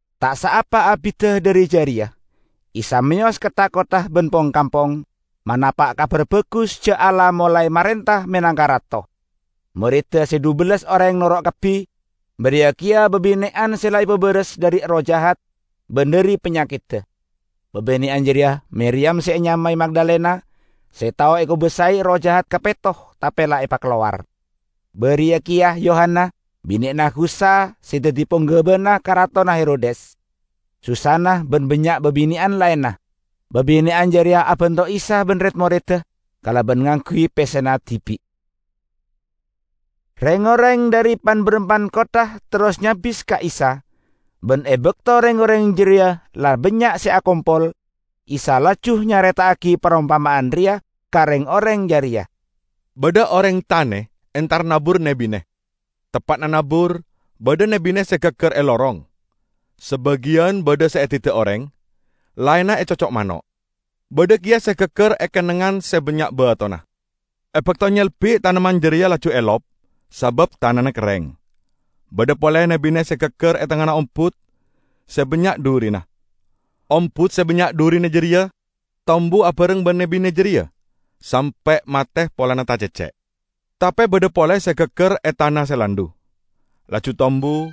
Ta' saapa abidda dhari jareya, Isa meyos ka tha-kottha ban pong-kampong, manapa' Kabar Bagus ja' Allah molae marenta menangka Rato. Moredda se dhubellas oreng noro' kabbi, bariya keya babine'an se la epabaras dhari erroh jahat ban dhari panyakedda. Babine'an jareya Miriyam se enyamae Magdalena (se tao ekobasae erroh jahat kapetto tape la epakalowar); bariya keya Yohana, binena Khuza se daddi ponggabana karatonna Herodes; Susanna, ban bannya' babine'an laenna. Babine'an jareya abanto Isa ban red-moredda kalaban ngangguy pessena dibi'. Reng-oreng dhari pan-barampan kottha terros nyabis ka Isa. Ban e bakto reng-oreng jareya la bannya' se akompol, Isa laju nyareta'agi parompama'an reya ka reng-oreng jareya; "Badha oreng tane entar nabur ne-bine. Teppa'na nabur, badha ne-bine se gaggar e lorong. Sabagiyan badha se edidda' oreng, laenna ecocco' mano'. Badha keya se gaggar e kennengngan se bannya' batona. E bakto nyelbi' tamennan jareya laju elop sabab tanana kerreng. Badha pole ne-bine se gaggar e tengngana ombut se bannya' dhurina. Ombut se bannya' dhurina jareya tombu abareng ban ne-bine jareya, sampe' mate polana tacecce'. Tape badha pole se gaggar e tana se landhu, laju tombu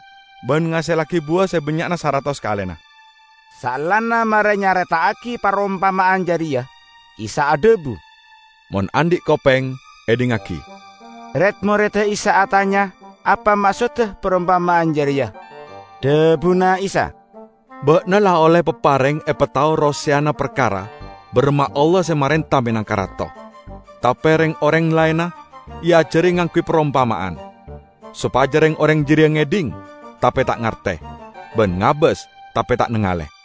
ban ngasellagi buwa se bannya'na saratos kalena." Saellana mare nyareta'agi parompama'an jareya, Isa adhabu, "Mon andhi' kopeng, edhingngagi!" Red-moredda Isa atanya apa maksodda parompama'an jareya. Dhabuna Isa, "Ba'na la olle papareng epatao roseyana parkara baramma Allah se marenta menangka Rato. Tape reng-oreng laenna eajari ngangguy parompama'an, sopaja reng-oreng jareya ngedhing tape ta' ngarte, ban ngabas tape ta' nangale!"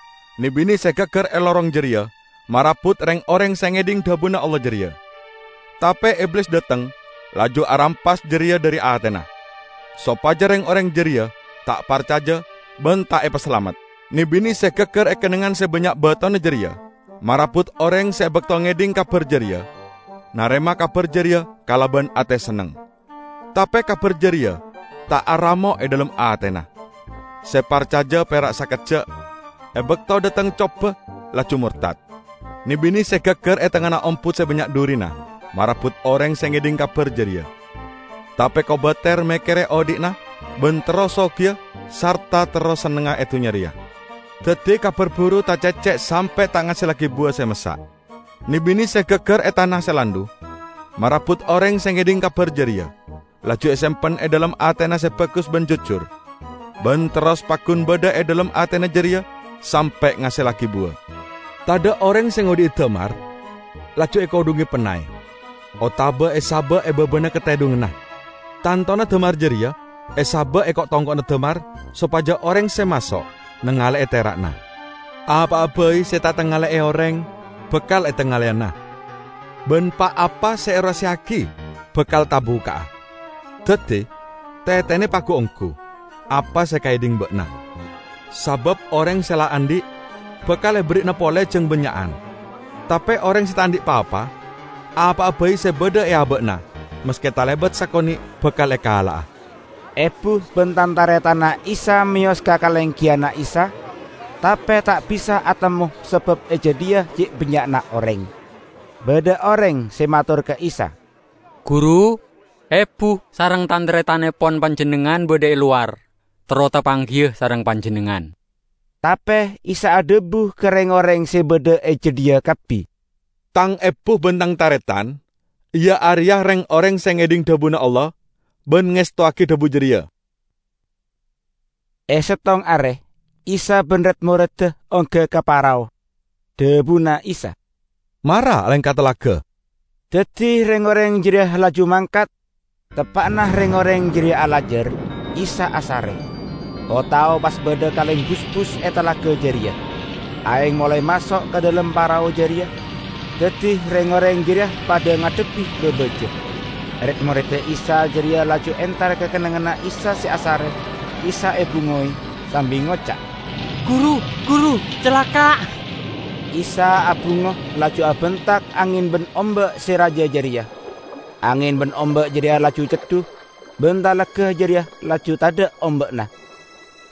Ne-bine se gaggar e lorong jareya marabut reng-oreng se ngedhing dhabuna Allah jareya. Tape Iblis dhateng laju arampas jareya dhari atena, sopaja reng-oreng jareya ta' parcaja ban ta' epasalamet. Ne-bine se gaggar e kennengngan se bannya' batona jareya marabut oreng se e bakto ngedhing kabar jareya, narema kabar jareya kalaban ate senneng. Tape kabar jareya ta' aramo' e dhalem atena. Se parcaja pera' sakejja'; e bakto dhateng coba laju mortad. Ne-bine se gaggar e tengngana ombut se bannya' dhurina marabut oreng se ngedhing kabar jareya, tape kobater mekkere odhi'na ban terro sogiya sarta terro sennengnga e dunnya reya. Daddi kabar buru tacecce' sampe' ta' ngasellagi buwa se massa'. Ne-bine se gaggar e tana se landhu marabut oreng se ngedhing kabar jareya, laju esempen e dhalem atena se bagus ban jujur, ban terros paggun badha e dhalem atena jareya sampe' ngasellagi buwa." "Tadha' oreng se ngodhi'i damar laju ekodhunge pennay otaba esaba' e babana katedhunganna. Tantona damar jareya esaba' e ko'-tongko'na damar sopaja oreng se maso' nangale'e tera'na. Apa'a bai se ta' etangale'e oreng bakal etangaleyana, ban pa-apa se eroseya'agi bakal tabukka'a. Daddi tetene pagu-onggu apa se ekaedhing ba'na. Sabab oreng se la andhi' bakal eberri'ana pole jang bannya'an; tape oreng se ta' andhi' pa-apa, apa'a bai se badha e aba'na, maske talebat sakone', bakal ekala'a." Ebu ban tan-taretanna Isa meyos ka kalenggiyanna Isa, tape ta' bisa atemmo sabab e jadhiya ce' bannya'na oreng. Badha oreng se mator ka Isa, "Guru, ebu sareng tan-taretannepon Panjennengngan badha e lowar, terro tapanggiya sareng Panjennengngan." Tape Isa adhabu ka reng-oreng se badha e jadhiya kabbi, "Tang ebu ban Tang taretan iya areya reng-oreng se ngedhing dhabuna Allah ban ngestowagi dhabu jareya." E settong are Isa ban red-moredda ongga ka parao. Dhabuna Isa, "Mara alengka talaga." Daddi reng-oreng jareya laju mangkat. Teppa'na reng-oreng jareya alajar, Isa asare. O-tao pas badha kaleng busbus e talaga jareya. Aeng molae maso' ka dhalem parao jareya, daddi reng-oreng jareya padha ngadhebbi babaja. Red-moredda Isa jareya laju entar ka kennengnganna Isa se asare Isa ebungowe, sambi ngoca', "Guru, Guru, calaka'!" Isa abungo laju abentak angen ban omba' se raja jareya. Angen ban omba' jareya laju ceddu, ban talaga jareya laju tadha' omba'na.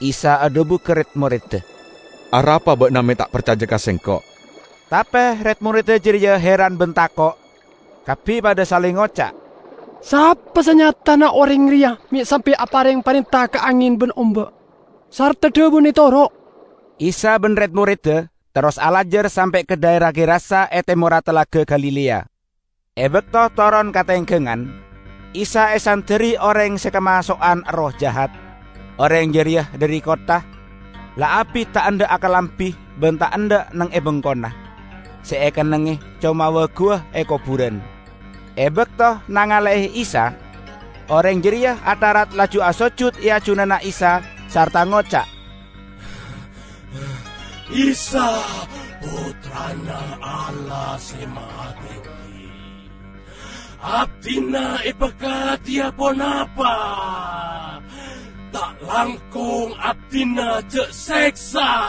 Isa adhabu ka red-moredda, "Arapa ba'na me' ta' parcaja ka Sengko'?" Tape red-moredda jareya heran ban tako'. Kabbi padha saleng ngoca', "Sapa sanyatana oreng reya me' sampe' apareng parenta ka angen ban omba', sarta dhabuna etoro'!" Isa ban red-moredda terros alajar sampe' ka dhaera Gerasa e temorra Talaga Galilea. E bakto toron ka tenggangan, Isa esanderri oreng se kamaso'an erroh jahat. Oreng jareya dhari kottha. La abit ta' endha' akalambi ban ta' endha' neng e bengkona. Se ekennengnge coma wa-guwa e koburan. E bakto nangale'e Isa, oreng jareya atharat laju asojud e ajunanna Isa sarta ngoca', "Isa, Pottrana Allah Se Mahatenggi! Abdina epakadiya ponapa? Ta' langkong abdina ja' seksa!"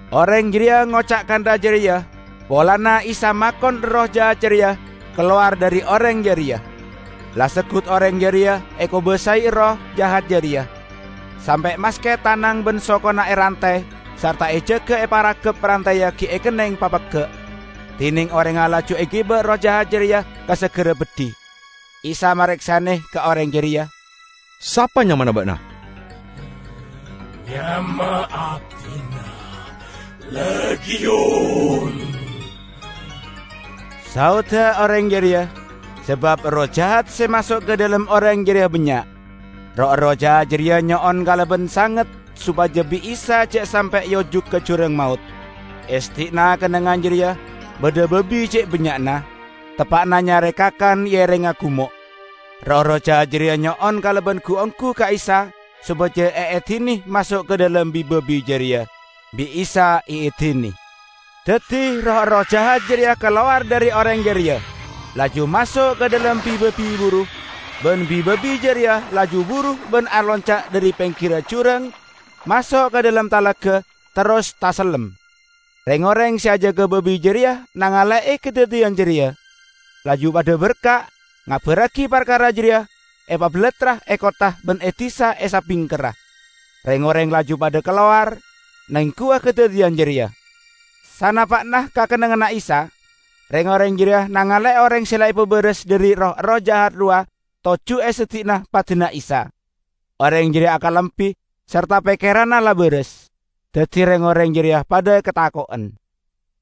Oreng jareya ngoca' kantha jareya polana Isa makon erroh jahat jareya kalowar dhari oreng jareya. La seggut oreng jareya ekobasae erroh jahat jareya, sampe' maske tanang ban sokona erantay sarta ejaga eparagap rantayya gi' ekenneng papegga', dineng orengnga laju egiba erroh jahat jareya ka sagara beddhi. Isa mareksane ka oreng jareya, "Sapa nyamana ba'na?" "Nyama abdina 'Legiun'," saodda oreng jareya -- sabab erroh jahat se maso' ka dhalem oreng jareya bannya'. Roh-erroh jahat jareya nyo'on kalaban sanget sopaja bi' Isa ja' sampe' eojuk ka Jurang Maot. E seddi'na kennengngan jareya badha babi ce' bannya'na, teppa'na nyare kakan e erengnga gumo'. Roh-erroh jahat jareya nyo'on kalaban gu-onggu ka Isa sopaja eedine maso' ka dhalem bi-babi jareya. Bi' Isa eedine. Daddi roh-erroh jahat jareya kalowar dhari oreng jareya, laju maso' ka dhalem bi-babi buru. Ban bi-babi jareya laju buru ban alonca' dhari penggirra jurang maso' ka dhalem talaga, terros tasellem. Reng-oreng se ajaga babi jareya nangale'e kadaddiyan jareya, laju padha berka' ngabarragi parkara jareya epabalattra e kottha ban e disa e sabingkerra. Reng-oreng laju padha kalowar nengguwa kadaddiyan jareya. Sanapa'na ka kennengnganna Isa, reng-oreng jareya nangale'e oreng se la epabaras dhari roh-erroh jahat rowa toju' e seddi'na padana Isa. Oreng jareya akalambi sarta pekkeranna la baras. Daddi reng-oreng jareya padha katako'en.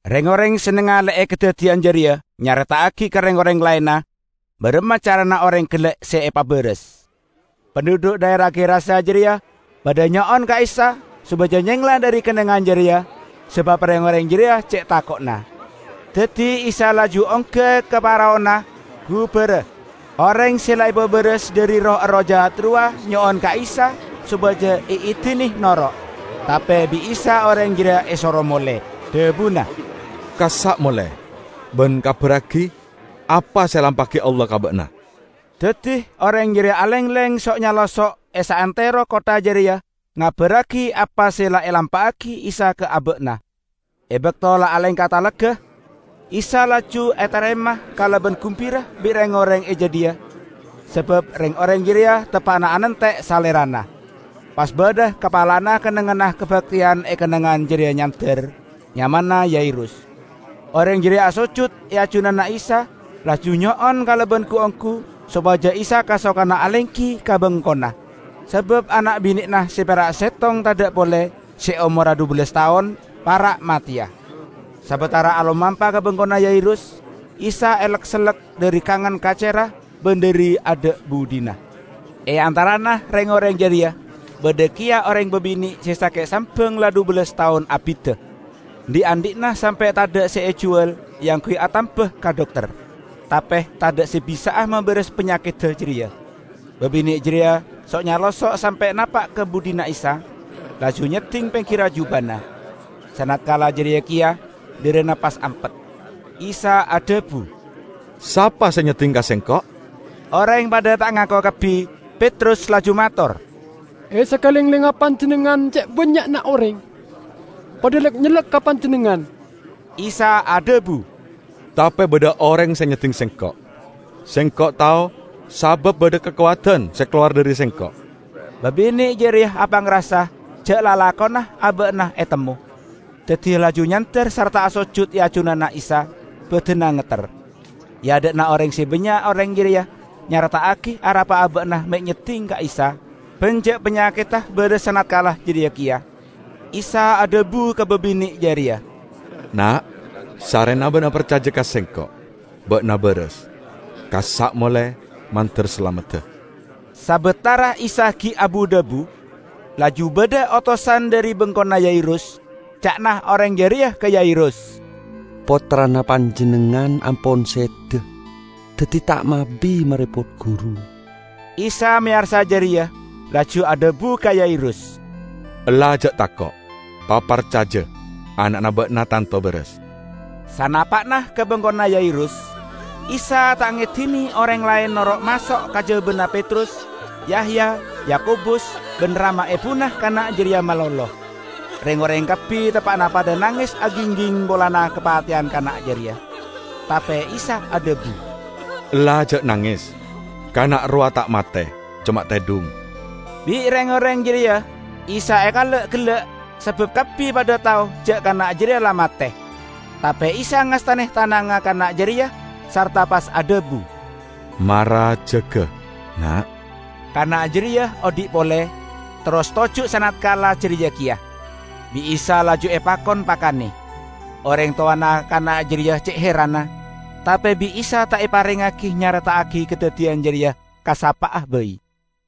Reng-oreng se nangale'e kadaddiyan jareya nyareta'agi ka reng-oreng laenna baramma carana oreng gella' se epabaras. Pandhudhu' dhaera Gerasa jareya padha nyo'on ka Isa sopaja nyengla dhari kennengngan jareya, sabab reng-oreng jareya ce' tako'na. Daddi Isa laju ongga ka paraona, gubara. Oreng se la epabaras dhari roh-erroh jahat rowa nyo'on ka Isa sopaja eedine noro'. Tape bi' Isa oreng jareya esoro mole, dhabuna, "Kassa' mole, ban kabarragi apa se elampa'agi Allah ka ba'na." Daddi oreng jareya alengleng so'-nyalosso' e saantero kottha jareya ngabarragi apa se la elampa'agi Isa ka aba'na. E bakto la alengka talaga, Isa laju etarema kalaban gumbira bi' reng-oreng e jadhiya sabab reng-oreng jareya teppa'na anante' Salerana. Pas badha kapalana kennengnganna kabakteyan e kennengngan jareya nyander. Nyamana Yairus. Oreng jareya asojud e ajunanna Isa laju nyo'on kalaban gu-onggu sopaja Isa kasokana alenggi ka bengkona, sabab ana' bine'na se pera' settong tadha' pole, se omorra dhubellas taon, para' mateya. Sabatara alomampa ka bengkona Yairus, Isa elek-sellek dhari kangan kacerra ban dhari adha' budhina. E antarana reng-oreng jareya badha keya oreng babine' se sake' sambang la dhubellas taon abidda. Dhi'-andhi'na sampe' tadha' se ejuwal eangguy atamba ka dokter, tape tadha' se bisa'a mabaras panyakedda jareya. Babine' jareya so'-nyalosso' sampe' napa' ka budhina Isa, laju nyedding penggirra jubana. Sanatkala jareya keya dharana pas ampet. Isa adhabu, "Sapa se nyedding ka Sengko'?" Oreng padha ta' ngako kabbi. Petrus laju mator, "E sakalenglengnga Panjennengngan ce' bannya'na oreng, padha lek-nyellek ka Panjennengngan!" Isa adhabu, "Tape badha oreng se nyedding Sengko'. Sengko' tao sabab badha kakowadan se kalowar dhari Sengko'." Babine' jareya apangrasa ja' lalakonna aba'na etemmo. Daddi laju nyander sarta asojud e ajunanna Isa, badanna ngetter. E adha'na oreng se bannya' oreng jareya nyareta'agi arapa aba'na me' nyedding ka Isa, ban ja' panyakedda baras sanatkala jareya keya. Isa adhabu ka babine' jareya, "Na', sarrena ba'na parcaja ka Sengko', ba'na baras. Kassa' mole, mandar salamedda." Sabatara Isa gi' abu-dhabu, laju badha otosan dhari bengkona Yairus. Ca'na oreng jareya ka Yairus, "Pottrana panjennengngan ampon seda. Daddi ta' mabi marepot Guru." Isa meyarsa jareya, laju adhabu ka Yairus, "Ella ja' tako'. Paparcaja, ana'na ba'na tanto baras." Sanapa'na ka bengkona Yairus, Isa ta' ngedine oreng laen noro' maso' kajabana Petrus, Yahya, Yakobus ban rama ebuna kana' jareya malolo. Reng-oreng kabbi teppa'na padha nanges agingging polana kapateyan kana' jareya. Tape Isa adhabu, "Ella ja' nanges. Kana' rowa ta' mate, coma tedhung!" Bi' reng-oreng jareya Isa ekala'-gella' sabab kabbi padha tao ja' kana' jareya la mate. Tape Isa ngastane tanangnga kana' jareya sarta pas adhabu, "Mara jaga, Na'!" Kana' jareya odhi' pole, terros toju' sanatkala jareya keya. Bi' Isa laju epakon pakane. Oreng towana kana' jareya ce' heranna. Tape bi' Isa ta' eparengngagi nyareta'agi kadaddiyan jareya ka sapa'a bai.